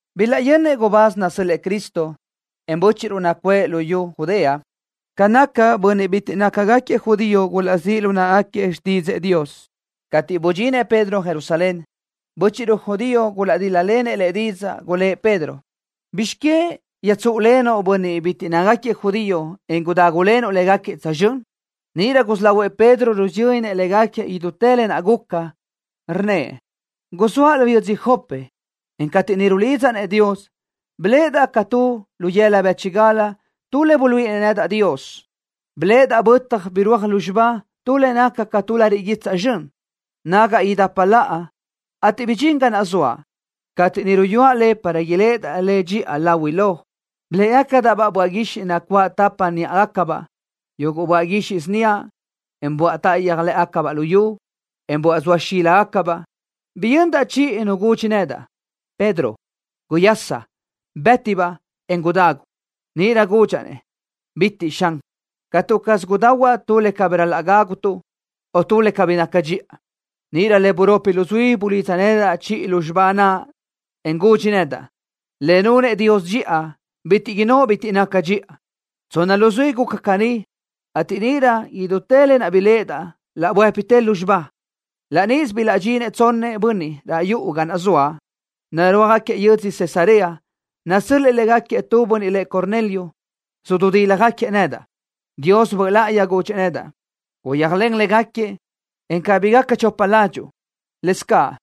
Bilaʼyönnëʼ gubáz nasö́l-lëʼë Cristo, en bö́chiʼruʼ nacuʼë luyú Judea ca naʼ bönniʼ bitiʼ nácagaquiëʼ judío gulaʼzíʼ lu náʼagaquiëʼ xtídzëʼë Dios. Cateʼ budxinëʼ Pedro Jerusalén, bö́chiʼruʼ judío gulaʼdíl-lalenëʼ lëʼ didzaʼ. Gulë́ʼ Pedro: —¿Bizx que yöjtsúʼulenuʼ bönniʼ bitiʼ nácagaquiëʼ judío, en gudágulenuʼ légaquiëʼ tsözxö́n? Níʼirö gusí lahuëʼ Pedro rusiyönnëʼ légaquiëʼ idútë lë naʼ guca, rnnëʼ: —Guzóaʼ lu yödzö Jope, en cateʼ niʼ rulidzaʼ-nëʼ Dios, biléʼedaʼ ca tu lu yëla bë́chigal tu le buluíʼinëʼ Dios nedaʼ. Biléʼedaʼ bötaj birúaj lúzxiba tu le naca ca tu lariʼ guitsaʼ zxön, nagaʼ idapa laʼa, ateʼ bidxín ga naʼ zoaʼ. Cateʼ niʼ ruyúaʼ le para iléʼedaʼ le dxía láhuilö, biléʼegacadaʼ-baʼ böaʼ guixiʼ nacuáʼ tapa níʼagacabaʼ, yuguʼ böaʼ guixiʼ síniaʼ, en böaʼ táʼayöj lë́ʼegacabaʼ lu yu, en böaʼ zoa xíligacabaʼ. Biyöndaʼ chiʼi nu gudxi nedaʼ: “Pedro, guyasa. Bëti-baʼ, en gudagu.” Níʼirö gudxaʼ-nëʼ: “Bitiʼ caʼ, Xan. Catu caz gudahuaʼ tu le cabí ral-laʼ gágutuʼ, o tu le cabí naca dxiʼa.” Níʼirö le buropi luzuí bulidza chiʼi lúzxiba naʼ nedaʼ, en gudxi nedaʼ: “Le nunëʼ Dios dxiʼa, bitiʼ innóʼ bitiʼ naca dxiʼa.” Tsonna luzuí guca caní, ateʼ níʼirö idútë lë naʼ biléʼedaʼ laʼ buë́pitë lúzxiba. Laʼ níʼisö bilaʼdxintëʼ tsonnëʼ bönniʼ raʼ yuʼu ga naʼ zoaʼ, narúajgaquiëʼ yödzö Cesarea, nasö́l-lëʼë légaquiëʼ tu bönniʼ lëʼ Cornelio. Sududíljagaquiëʼ nedaʼ. Dios Böʼ Láʼayi gudxëʼ nedaʼ: “Guyéajlen légaquiëʼ, en cabí gaca chopa ládxuʼu.” Lëscaʼ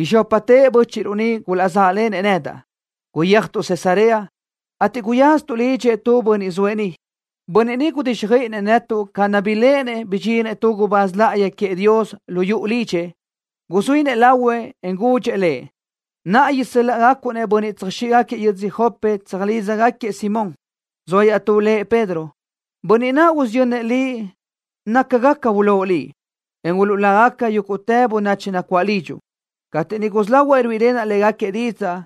izxópatëʼ bö́chiʼruʼ ni gulaʼzáʼlenëʼ nedaʼ tsözxö́n. Guyéajtuʼ Cesarea, ateʼ guyaztuʼ lidxëʼ tu bönniʼ zoëʼ niʼ. Bönniʼ niʼ gudíxjöiʼinëʼ netuʼ ca naʼ biléʼenëʼ, bidxinëʼ tu gubáz láʼayi queëʼ Dios lu yuʼu lidxëʼ. Guzuínëʼ lahuëʼ, en gudxëʼ lëʼ: “Naʼa isö́l-laʼgacuʼ-nëʼ bönniʼ tsöjáquiëʼ yödzö Jope, tsöjlídzagaquiëʼ Simón, zoa iaʼtú lëʼ Pedro. Bönniʼ naʼ usiyönnëʼ liʼ naca gaca ulóʼ liʼ, en uluʼlágaca caʼ yúguʼtë bönachi nacuáʼ lidxuʼ.” Cateʼ niʼ gusí lahuaʼ ruíʼilenaʼ légaquiëʼ didzaʼ,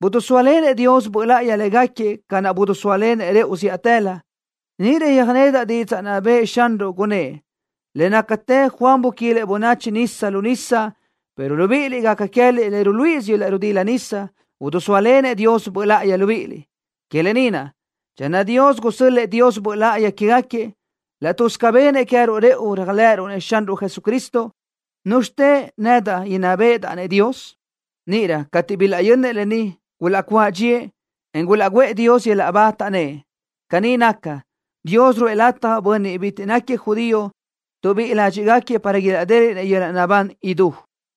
bidisóalenëʼ Dios Böʼ Láʼayi légaquiëʼ ca naʼ bidisóalenëʼ rëʼu zíʼatëlö. Níʼirö yöjnedaʼ didzaʼ naʼ bëʼë Xanruʼ, gunnë́ʼ: “Le nácatë Juan buquilëʼ bönachi nisa lu nisa, pero libíʼiliʼ, gaca queë́liʼ le ruluíʼisö yöl-laʼ ridila nisa naʼ, idisóalenëʼ Dios Böʼ Láʼayi libíʼiliʼ.” Que lë ni naʼ, channö Dios gusö́l-lëʼë Dios Böʼ Láʼayi quégaquiëʼ, laʼ tuz ca benëʼ queë́ruʼ rëʼu réajlëʼëruʼ Xanruʼ Jesucristo, ¿núzxitë nedaʼ inná béʼedaʼ-nëʼ Dios? Níʼirö, cateʼ bilaʼyönnëʼ lë ni, gulaʼcuáʼ dxíëʼ, en gulaʼguʼë Dios yöl-laʼ ba, taʼnnë́ʼ: —Caní naca, Dios ruʼë lataj bönniʼ bitiʼ nácagaquiëʼ judío, tuʼbíʼi ládxiʼgaquiëʼ para ilaʼdéliʼnëʼ yöl-laʼ naʼbán idú.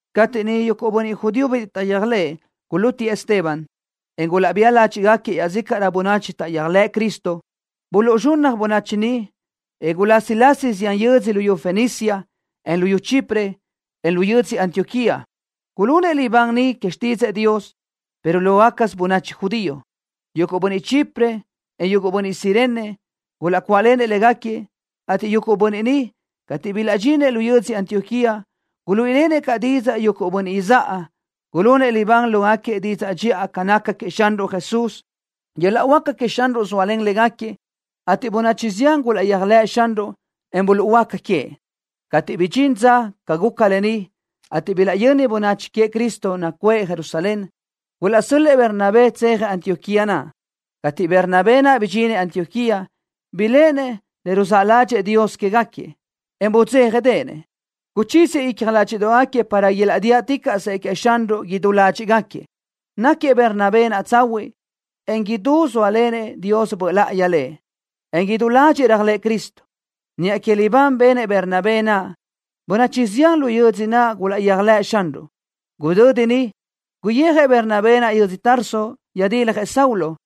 Cateʼ niʼ yuguʼ bönniʼ judío bitiʼ taʼyéajlëʼë gulútiëʼ Esteban, en gulaʼbía ládxiʼgaquiëʼ iaʼzícaʼrö bönachi taʼyéajlëʼ Cristo, buluʼzxunnaj bönachi ni, en gulásilasi zián yödzö luyú Fenicia, en luyú Chipre, en lu yödzö Antioquía. Gulunëʼ libán niʼ que xtídzëʼë Dios, pero lógacasö bönachi judío. Yuguʼ bönniʼ Chipre, en yuguʼ bönniʼ Cirene, gulaʼcuáʼlenëʼ légaquiëʼ, ateʼ yuguʼ bönniʼ ni, cateʼ bilaʼdxinëʼ lu yödzö Antioquía, guluíʼilenëʼ caʼ didzaʼ yuguʼ bönniʼ izáʼa. Gulunëʼ libán lógaquiëʼ que didzaʼ dxiʼa ca naca queëʼ Xanruʼ Jesús. Yöl-laʼ huáca queëʼ Xanruʼ guzóalen légaquiëʼ, ateʼ bönachi zián gulaʼyéajlëʼ Xanruʼ, en buluʼhuöáca queëʼ. Cateʼ bidxín didzaʼ ca guca lë ni, ateʼ bilaʼyönnëʼ bönniʼ queëʼ Cristo nacuʼë Jerusalén, gulaʼsö́l-lëʼë Bernabé tséajëʼ Antioquía naʼ. Cateʼ Bernabé naʼ bidxinëʼ Antioquía, biléʼenëʼ le ruzáʼ ládxëʼë Dios quégaquiëʼ, en budzéjanëʼ. Guchíziëʼ icja nágagaquiëʼ para ilaʼdíaʼticaʼsëʼ queëʼ Xanruʼ idú ládxiʼgaquiëʼ. Náquiëʼ Bernabé naʼ tsahuiʼ, en idú zóalenëʼ Dios Böʼ Láʼayi lëʼ, en idú ládxëʼë réajlëʼë Cristo. Niʼa que libán benëʼ Bernabé naʼ, bönachi zián lu yödzö naʼ gulaʼyéajlëʼ Xanruʼ. Gudödi niʼ, guyijëʼ Bernabé naʼ yödzö Tarso, yöjdiljëʼ Saulo.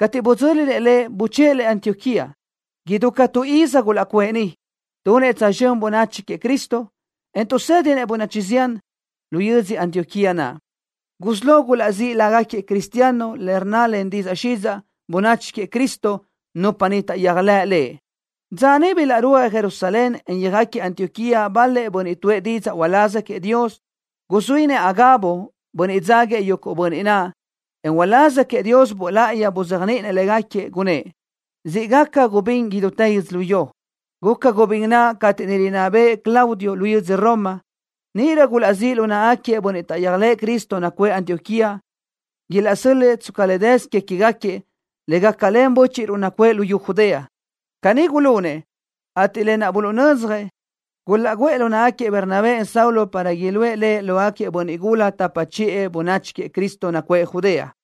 Cateʼ budzö́linëʼ lëʼ, buchë́ʼë lëʼ Antioquía. Idú ca tu iz gulaʼcuʼë niʼ, tunëʼ tsözxö́n bönachi queëʼ Cristo, en tuʼsë́dinëʼ bönachi zián. Lu yödzö Antioquía naʼ, gusí lo gulaʼzíʼ lágaquiëʼ cristiano le rnna len didzaʼ xidzaʼ: Bönachi Queëʼ Cristo, nupa niʼ taʼyéajlëʼ Lëʼ. Dza niʼ bilaʼrúajëʼ Jerusalén, en yöjáquiëʼ Antioquía bal-lëʼ bönniʼ tuʼë didzaʼ uláz queëʼ Dios. Guzuínëʼ Agabo, bönniʼ dzáguiëʼ yuguʼ bönniʼ naʼ, en uláz queëʼ Dios Böʼ Láʼayi buzéajniʼinëʼ légaquiëʼ, gunnë́ʼ: —Siʼ gaca gubín idútë yödzölió. Guca gubín naʼ cateʼ niʼ rinná bëʼë Claudio, lu yödzö Roma. Níʼirö gulaʼzíʼ lu náʼagaquiëʼ bönniʼ taʼyéajlëʼë Cristo nacuʼë Antioquía, ilaʼsö́l-lëʼë tsca le dësö que queë́gaquiëʼ, le gácalen bö́chiʼruʼ nacuʼë luyú Judea. Caní gulunëʼ, ateʼ lë naʼ buluʼnödzjëʼ, gulaʼguʼë lu náʼagaquiëʼ Bernabé, en Saulo para iluʼë le lógaquiëʼ bönniʼ gula tapa chiʼë bönachi queëʼ Cristo nacuʼë Judea.